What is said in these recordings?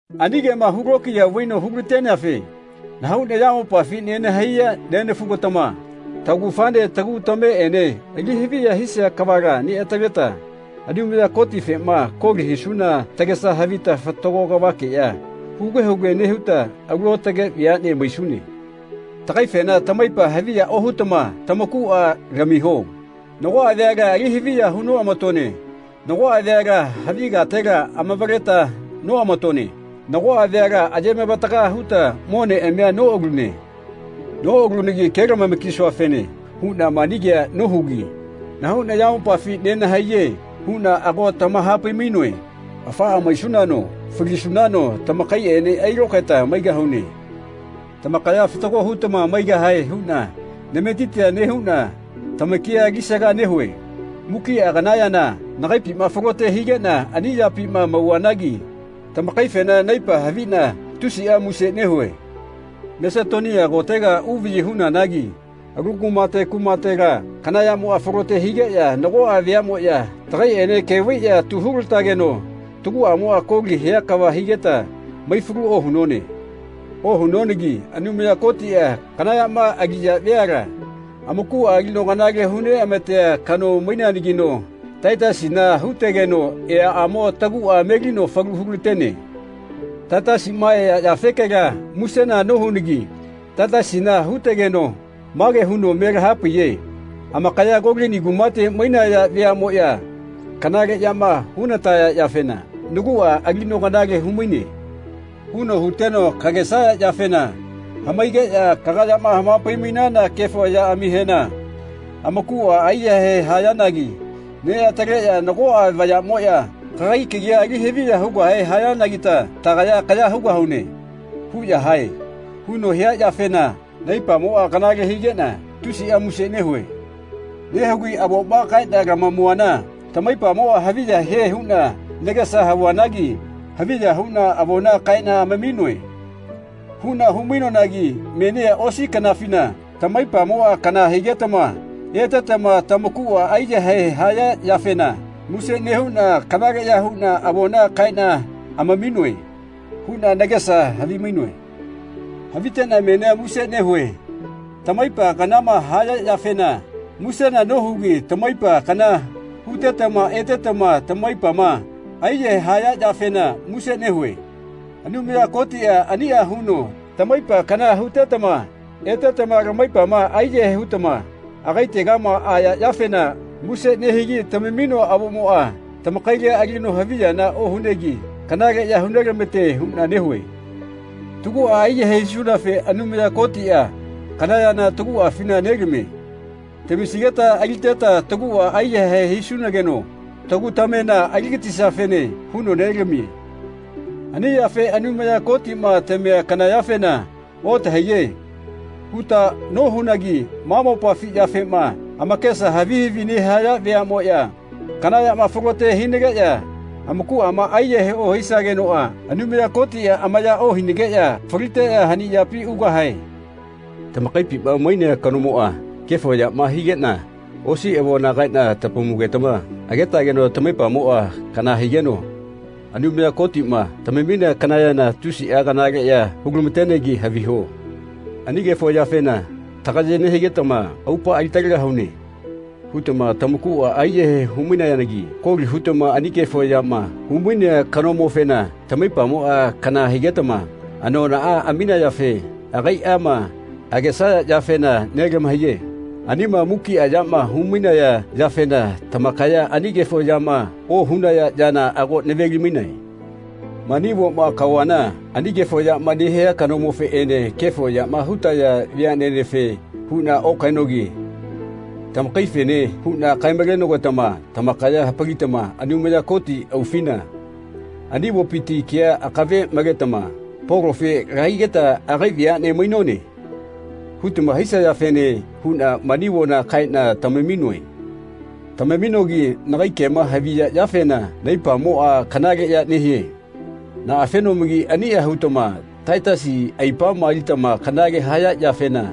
Ani kema hulokiya vaino hulateneafe nahau nayamopafi nenahaiya nenafu-gatama taugafaene tagu tameꞌene ali haviya hisia kavala neꞌataleteta Anumaya Kotifema koli hisuna tagesa havita fatago kavakeꞌya huge huge nehuta alu aotage veaꞌne maisune. Tagaifena tamaipa haviya ohutama tamakuꞌa lamiho. Nagoꞌa veala ali haviya hu noꞌamatone. Nagoꞌa veala havi katela amavaleta noꞌamatone. Nagoꞌa veala ayemavataga huta moneꞌamia noꞌalune. Noꞌalunagi kelamama-kisuafene huꞌna mani kea nohugi “Nahau nayamopafi nenahaiye.” huꞌna ago tamahapai-mainoe. Afaꞌa maisunano falisunano tamakaiꞌene ailokaeta maigahune. Tamakaya fatago hutama maigahae huꞌna nametitia nehuꞌna tamakia alisaga nehue. Mukiꞌa kana yana nagaipima falote higeꞌna ani yapima mauvanagi tamakaifena naipa haviꞌna tusiꞌa muse nehue. Masetonia kotega uvaꞌyi hunanagi alu kumate kumatela kana yamoꞌa falote higeꞌya nagoꞌa veaꞌmoꞌya tagaiꞌene ke vaiꞌya tu hulatageno taguꞌamoꞌa koli hia kava higeta maifalua ohunone. Ohunonagi Anumaya Kotiꞌa kana yama aliya veala amakuꞌa alino kanale huneꞌamatea kano maineanagino Taitasina hutegeno eaꞌamo taguꞌa melino falu hulatene. Taitasiꞌma ea yafekela musena nohunagi Taitasina hutageno mage huno me lahapaiye “Amakaya Kolini kumate mainaya veaꞌmoꞌya kanale yama hunataya yafena naguꞌa alino kanale humaine.” huno huteno “Kagesaya yafena hamaigeꞌya kagayama hamapai-mainana kefo yaꞌamihena amakuꞌa aiyahae hayanagi neꞌataleꞌya ‘Nagoꞌa vayaꞌmoꞌya kagai kagia ali haviya hugahe hayanagita tagaya kaya hugahune.’ huꞌya hae.” huno hia yafena naipamoꞌa kanale higeꞌna tusiꞌa muse nehue. Nehugi avoma kaeꞌna lamamuana tamaipamoꞌa haviya hie huꞌna nagesa havuanagi “Haviya huꞌna avona kaeꞌna amaminoe.” huꞌna hu-mainoanagi menia osi kanafina tamaipamoꞌa kana higetama etetama tamakuꞌa aiyahae haya yafena muse nehuꞌna “Kanaleꞌya huꞌna avona kaeꞌna amaminoe.” huꞌna nagesa havimainoe. Haviteꞌna menia muse nehue. Tamaipa kanama haya yafena musena nohugi tamaipa kana hutetama etetama tamaipama aiyahae haya yafena muse nehue. Anumaya Kotiꞌa aniꞌa huno tamaipa kana hutetama etetama lamaipama aiyahae hutama agaitegama aya yafena muse nehigi tamaminoa avomoꞌa tamakaila alino haviyana ohunegi kanaleꞌya hulamatene huꞌna nehue. Taguꞌa aiyahae hisunafe Anumaya Kotiꞌa kana yana taguꞌafina nelamie. Tamisigeta aliteta taguꞌa aiyahae hisunageno tagu tamena aligatisiafene huno nelamie. Ani yafe Anumaya Kotiꞌma tamia kana yafena “Otahaiye.” huta nohunagi ma mopafi yafema amakesa havi havi nehaya veaꞌmoꞌya kana yama falote hinageꞌya amakuꞌama aiyahae ohisagenoꞌa Anumaya Kotiꞌa amaya ohinageꞌya faliteꞌya hani yapi ugahae. Tamakaipima mainea kanomoꞌa kefo yama higeꞌna osi avona kaeꞌna tamamugetama agetageno tamaipamoꞌa kana higeno Anumaya Kotiꞌma tamaminea kana yana tusiꞌa kanaleꞌya hulamatenegi haviho. Ani kefo yafena “Tagaye nehinagetama aupaꞌa alitalegahune.” hutama tamakuꞌa aiyahae humainagi koli hutama ani kefo yama humainea kanomofena tamaipamoꞌa kana higetama anonaꞌa aminayafe nagaiꞌma nagesaya yafena nelamahaiye. Anima mukiꞌa yama humainaya yafena tamakaya ani kefo yama ohunaya yana ago naveli-mainae. Mani avoma kaovana ani kefo yama nehia kanomofeꞌene kefo yama hutaya veaꞌnenefe huꞌna okaenogi tamakaife huꞌna kae-malogetama tamakaya hapalitama Anumaya Koti aufina ani avopiti kea akave maletama “Polofe lahaigeta agai veaꞌne mainone.” hutama hisayafene huꞌna mani avona kaeꞌna tamaminoe. Tamaminogi nagai kema haviya yafena naipamoꞌa kanaleꞌya nehie. Naꞌafenomagi aniꞌa hutama Taitasi aipama alitama kanale haya yafena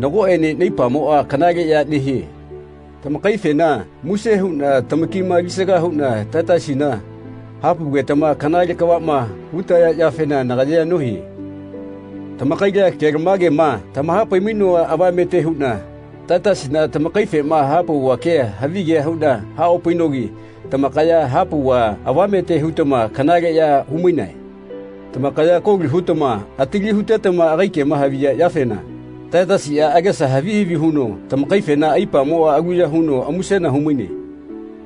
nagoꞌene naipamoꞌa kanaleꞌya nehie. Tamakaifena muse huꞌna tamakima alisaga huꞌna Taitasina hapaugetama kanale kavaꞌma hutaya yafena nagayea nohie. Tamakaila kelamagema tamahapai-mainoa avamete huꞌna Taitasina tamakaifema hapauva kea havigea huꞌna haꞌopainogi tamakaya hapauva avamete hutama kanaleꞌya humainae. Tamakaya koli hutama atali hutetama agai kema haviya yafena Taitasiꞌa agesa havi havi huno tamakaifena aipamoꞌa aluya huno musena humaine.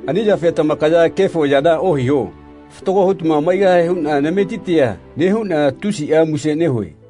Ani yafe tamakaya kefo yana ohiho. Fatago hutama maigahae huꞌna nametitia nehuꞌna tusiꞌa muse nehue.